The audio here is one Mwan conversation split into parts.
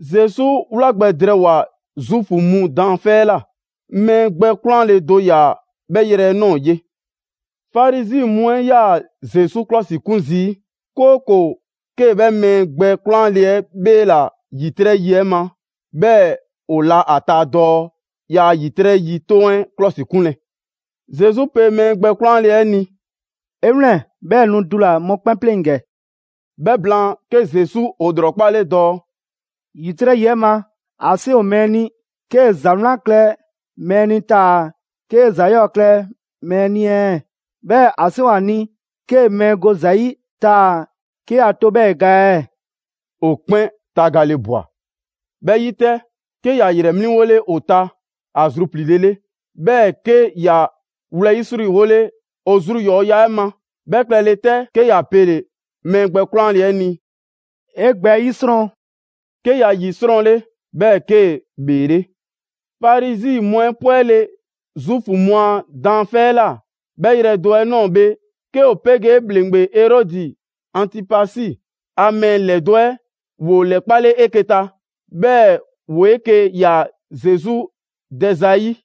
Zesu wla gbɛ drɛɛwoa‑ Zuufu mu daanfɛ' 'ɛ ꞊la. Mɛɛ gbɛ 'kwlanle‑ do ‑yaa 'bhɛ yrɛ 'ɛ ꞊nɔɔ ye. Farizi mu 'ɛ 'yaa‑ Zesu klɔsikun zii', 'kooko‑ 'kee‑ 'bhɛ mɛɛ gbɛ 'kwlanle‑ 'ɛ 'bheela‑ ‑yitrɛ' yi 'ɛ ma, 'bhɛɛ‑ ‑o la ‑a ta dɔɔ yaa ‑yitrɛ' yi 'toŋ 'ɛ 'klɔsikunlɛ. Zesu pe mɛɛ gbɛ 'kwlanle‑ 'ɛ ni: «'E 'wlɛn‑, 'bhɛɛ‑ nu dula‑ mɔkpɛn' 'pleŋ‑ ‑gɛ!» 'Bhɛ blaan, 'ke Zesu ‑o ‑lrɔkpale dɔɔ: «‑Yitrɛ' yi 'ɛ ma, ‑a 'seŋ ‑o mɛɛ ni 'kee‑ ‑za 'wlan klɛ mɛɛ ni taa‑ 'kee‑ ‑za 'yɔɔ‑ klɛ mɛɛ ni ɛɛ, 'bhɛɛ‑ ‑a 'seŋ ‑o ‑a ni 'kee‑ mɛɛ go ‑za 'yi taa‑ 'ke ‑ya to 'bhɛɛ‑ ‑e ga ɛɛ?» ‑O ‑kpɛn tagale ꞊bwa. 'Bhɛ 'yi 'tɛ, 'ke ‑ya ‑yrɛ 'mliŋgole ‑o ta ‑a zrupliile 'le. 'Bhɛɛ‑ 'ke ‑ya wlɛyisriwole ‑o zru ‑yɔɔya' 'ɛ ma. 'Bhɛ klɛle 'tɛ, 'ke ‑ya 'pele‑ mɛɛ gbɛ 'kwlanle‑ 'ɛ ni: «'E gbɛ 'ɛ 'yisrɔn!» 'Ke ‑ya 'yisrɔnle, 'bhɛɛ‑ 'kee‑ ‑bheele'. Farizi mu 'ɛ 'pwɛle‑ Zuufu mu a daanfɛ' 'ɛ ꞊la, 'bhɛ yrɛ do 'ɛ ꞊nɔɔ bhe, 'ke ‑o 'pegee ‑bhleŋgbe Erɔdi Antipasi a mɛɛ ‑lɛdo' 'ɛ ‑woo ‑lɛkpale 'eke‑ ta, 'bhɛɛ‑ ‑woo 'eke‑ ꞊ya Zesu dɛza 'ɛ 'yi.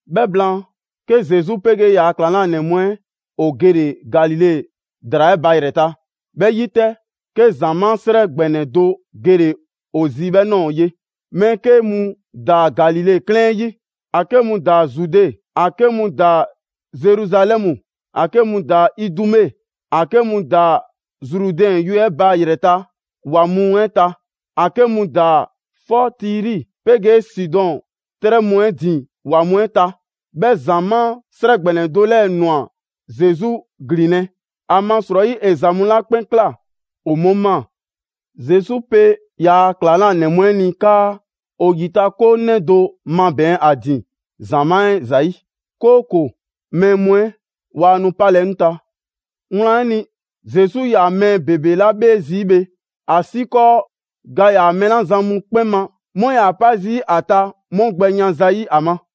'Bhɛ blaan, 'ke Zesu 'pegee ‑yaa' ‑klaŋlanɛ mu 'ɛ ‑o gele‑ Galile ‑draa 'ɛ ba ‑yrɛ ta. 'Bhɛ 'yi 'tɛ, 'ke ‑zamaa' 'srɛ ‑gbɛnɛ do gele‑ ‑o zi 'bhɛ ꞊nɔɔ ye. Mɛɛ 'ke mu ‑daa Galile 'klɛɛn 'ɛ 'yi, ‑a 'ke mu ‑daa Zude, ‑a 'ke mu ‑daa Zeruzalɛmu, ‑a 'ke mu ‑daa Idume, ‑a 'ke mu ‑daa Zrudɛn yue ba ‑yrɛta' ‑wa mu 'ɛ ta, ‑a 'ke mu ‑daa 'fɔ Tiri 'pegee Sidɔn 'trɛ mu 'ɛ ‑din ‑wa mu 'ɛ ta. 'Bhɛ ‑zamaa' 'srɛ ‑gbɛnɛ do 'lɛɛ‑ ꞊nwa Zesu ‑glinlɛ', ‑amasrɔyi, ‑e ‑za mu 'la 'kpɛn ꞊kla, ‑o 'mu ꞊maa. Zesu pe ‑yaa' ‑klaŋlanɛ mu 'ɛ ni 'kaa ‑o ‑yitakoŋ 'nɛ do mabɛɛn ‑a ‑din ‑zamaa' 'ɛ ‑zayi', 'kooko‑ mɛɛ mu 'ɛ waa nu 'palɛ‑ 'ŋ ta. Wlan 'ɛ ni, Zesu 'yaa‑ mɛɛ ‑bebe 'la 'bhee zii' bhe, ‑asiikɔɔ ga ‑yaa mɛɛ 'la za mu 'kpɛn ma, 'mu 'yaa‑ 'pa zii' ‑a ta 'mu gbɛ yan zayi' ‑a ma.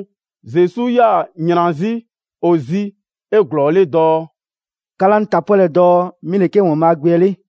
'Duŋ‑ Zesu 'yaa‑ ‑yran 'zi ‑o zi 'eglɔɔle dɔɔ: «'Ka 'laa 'ŋ ta 'pwɛlɛ‑ dɔɔ 'mi ‑le 'ke ‑Waanbhaa' Gbe 'ɛ 'le.»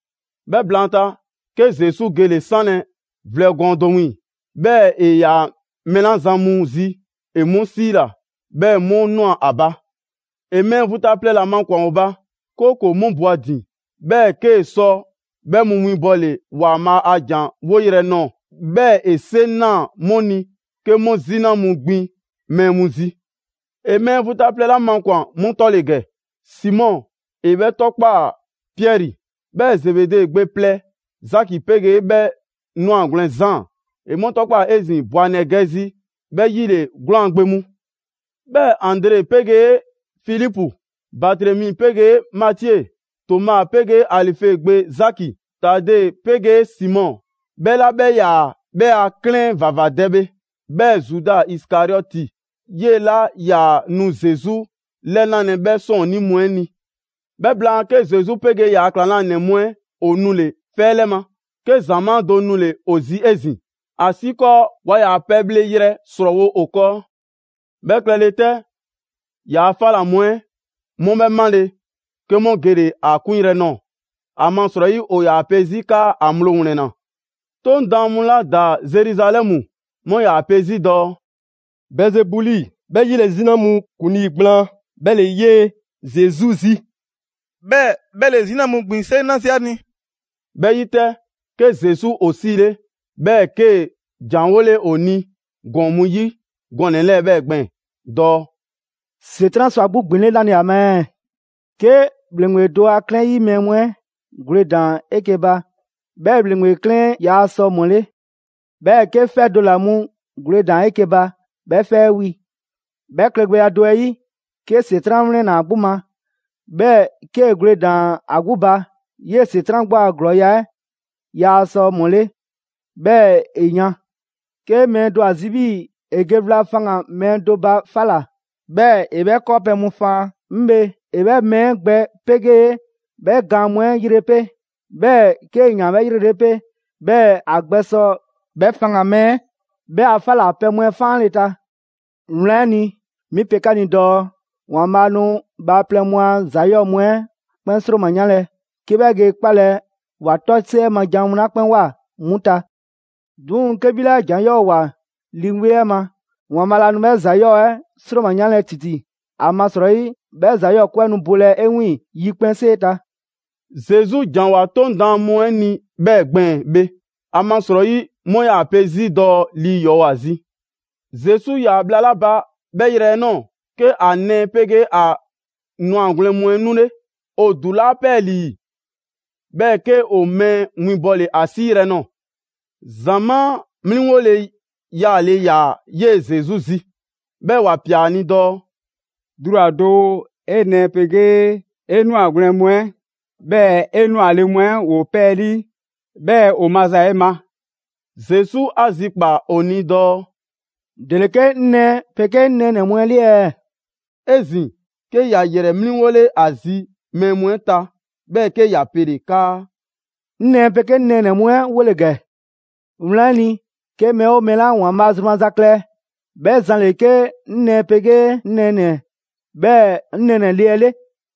'Bhɛ blaanta, 'ke Zesu gele‑ 'sanlɛ‑ vlɛ gɔɔn do wiiŋ‑, 'bhɛɛ‑ ‑e ‑yaa mɛɛ 'la zan mu zi, ‑e 'mu 'siila‑; 'bhɛɛ‑ 'mu ꞊nwa ‑a ba. ‑E mɛɛ vu ta plɛ ‑la makwan‑ ‑o ba, 'kooko‑ 'mu bo a ‑din. 'Bhɛɛ‑ 'kee‑ sɔ 'bhɛ mu 'winbɔle ‑Waanbhaa' a ‑jan 'woyrɛ‑ nɔɔ‑, 'bhɛɛ‑ ‑e 'seŋ ꞊naa 'mu ni 'ke 'mu 'zina mu ‑gbin mɛɛ mu zi. ‑E mɛɛ vu ta plɛ 'la makwan‑ 'mu 'tɔ ‑le ‑gɛ: Simɔ, ‑e 'bhɛ 'tɔkpaa‑ Piɛri, 'bhɛɛ‑ Zebede gbe plɛ Zaki 'pegee 'bhɛ ꞊nwagwlɛn Zaan, ‑e 'mu 'tɔkpaa‑ 'ezin‑ Boanɛɛgɛzi, 'bhɛ 'yile‑: ‑gblaŋ' gbe mu. 'Bhɛɛ‑ Andre 'pegee Filipu, Batremi 'pegee Matie, Toma 'pegee Alife gbe Zaki, Tade 'pegee Simɔ ('bhɛ 'la 'bhɛ 'yaa‑ 'bhɛ a 'klɛɛn ‑vavadɛ bhe), 'bhɛɛ‑ Zuda Isikariɔti, 'yee‑ 'la 'yaa nu Zesu 'lɛnalɛ 'bhɛ 'sɔɔnnii mu 'ɛ ni. 'Bhɛ blaan, 'ke Zesu 'pegee ‑yaa' ‑klaŋlanɛ mu 'ɛ ‑o nule‑ 'fɛ 'lɛ ma, 'ke ‑zamaa' do nule‑ ‑o zi 'ezin‑, ‑asiikɔɔ ‑waa ‑yaa pɛbhleyrɛ ‑srɔɔwo' ‑o 'kɔɔ. 'Bhɛ klɛle 'tɛ, ‑yaa' 'fa ‑la mu 'ɛ 'mu 'bhɛ 'male‑, 'ke 'mu gele‑ ‑a 'kunyrɛ‑ nɔɔ‑, ‑amasrɔyi ‑o ‑yaa pe 'zi 'kaa ‑a ŋgblo ‑wlɛnna. 'Toŋ daan mu 'la ‑daa Zeruzalɛmu, 'mu 'yaa‑ pe 'zi dɔɔ: «Bɛɛzebuli, ('bhɛ 'yi ‑le 'zina mu ‑kuŋlii' gblaan), 'bhɛ ‑le 'yee‑ Zesu zi. 'Bhɛɛ‑ 'bhɛ ‑le 'zina mu ‑gbin 'seŋ na zii' ‑a ni.» 'Bhɛ 'yi 'tɛ, 'ke Zesu ‑o 'siile‑, 'bhɛɛ‑ 'kee‑ ‑janwole 'o ni ‑gɔɔn mu 'yi gɔnɛ‑ 'lɛɛ‑ 'bhɛɛ‑ gbɛɛn‑ dɔɔ: «‑Setran' sɔ ‑a 'gbu ‑gbinle' 'nale‑ ‑a ma ɛɛ? 'Ke ‑bhleŋgbe do a 'klɛɛn 'yi mɛɛ mu 'ɛ gwledan 'eke‑ ba, 'bhɛ ‑bhleŋgbe 'klɛɛn 'ɛ yaa sɔ ‑mɔle'. 'Bhɛɛ‑ 'ke 'fɛ do ‑la mu gwledan 'eke‑ ba, 'bhɛ 'fɛ 'ɛ wi. 'Bhɛ klɛgbɛya do 'ɛ 'yi, 'ke ‑Setran' 'wlɛnna‑ ‑a 'gbu ma, 'bhɛɛ‑ 'kee‑ gwledan ‑a 'gbu ba; 'yee‑ ‑Setran' 'gbu ‑a ‑glɔɔya' 'ɛ yaa sɔ ‑mɔle', 'bhɛɛ‑ ‑e yan.» «'Ke mɛɛ do ‑o ‑a zi 'bhii‑ ‑e ge wla faŋgan‑ mɛɛ do ba 'fa ꞊la, 'bhɛɛ‑ ‑e 'bhɛ 'kɔɔpɛ‑ mu faan, 'ŋ bhe, ‑e 'bhɛ mɛɛ 'ɛ gbɛ 'pegee 'bhɛ gaan mu 'ɛ yre 'pe. 'Bhɛɛ‑ 'kee‑ ‑yaan 'bhɛ yrelele 'pe, 'bhɛɛ‑ ‑a gbɛsɔ 'bhɛ faŋgan‑ mɛɛ 'ɛ 'bhɛ a 'fa ‑la pɛ mu 'ɛ 'faanle ta. Wlan 'ɛ ni, 'mi pe 'ka ni dɔɔ: ‑Waanbhaa' nu bhaaplɛŋ mu a ‑za 'yɔɔ‑ mu 'ɛ 'kpɛn ‑sroma 'yanlɛ‑, 'ke 'bhɛ ge 'kpalɛ‑ ‑wa 'tɔsiɛ ma jan 'mu 'la 'kpɛn ꞊woa 'mu ta. 'Duŋ‑ 'ke 'bhi 'la ꞊jan 'yɔɔ‑ ꞊woa Lii 'Weŋ 'ɛ ma, ‑Waanbhaa' laa nu 'bhɛ ‑za 'yɔɔ‑ 'ɛ 'sroma‑ 'yanle ‑titi, ‑amasrɔyi 'bhɛ ‑za 'yɔɔ‑ 'kwe 'ɛ nu bolɛ 'e wiiŋ‑ 'yikpɛnsee ta.» Zesu ‑janwoa 'Toŋ daan mu 'ɛ ni 'bhɛ gbɛɛn‑ bhe, ‑amasrɔyi 'mu 'yaa‑ pe 'zi dɔɔ lii ‑yɔɔ' ‑o ‑a zi. Zesu 'yaa‑ bhla 'la ba 'bhɛ yrɛ 'ɛ ꞊nɔɔ, 'ke ‑a nɛɛ 'pegee ‑a ꞊nwagwlɛn' mu 'ɛ 'nule. ‑O ‑dulaa' 'pɛɛlii‑, 'bhɛɛ‑ 'ke ‑o mɛɛ winbɔle ‑a 'siiyrɛ‑ nɔɔ‑. ‑Zamaa' 'mliŋgole yaale ‑yaa 'yee‑ Zesu zi, 'bhɛɛ‑ ‑wa ꞊pia ‑a ni dɔɔ: «Dula‑ doo, 'e nɛɛ 'pegee 'e ꞊nwagwlɛn' mu 'ɛ, 'bhɛɛ‑ 'e 'nwale‑ mu 'ɛ ‑woo 'pɛɛlii‑. 'Bhɛɛ‑ ‑o maza 'e ma.» Zesu 'a zikpaa‑ ‑o ni dɔɔ: «‑Dele 'ke 'ŋ nɛɛ 'pegee 'ŋ nɛɛnɛ‑ mu 'ɛ 'le ɛɛ?» 'Ezin‑ 'ke ‑ya ‑yrɛ 'mliŋgole ‑a zi mɛɛ mu 'ɛ ta, 'bhɛɛ‑ 'ke ‑ya pele‑ 'kaa: «'Ŋ nɛɛ 'pegee 'ŋ nɛɛnɛ‑ mu 'ɛ 'wole‑ ‑gɛ. Wlan 'ɛ ni, 'ke mɛɛ 'oo mɛɛ 'la ‑Waanbhaa' zru maza klɛ, 'bhɛ zan ‑le 'ke 'ŋ nɛɛ 'pegee 'ŋ nɛɛnɛ‑, 'bhɛɛ‑ 'ŋ nɛɛ ‑nɛ le 'ɛ 'le.»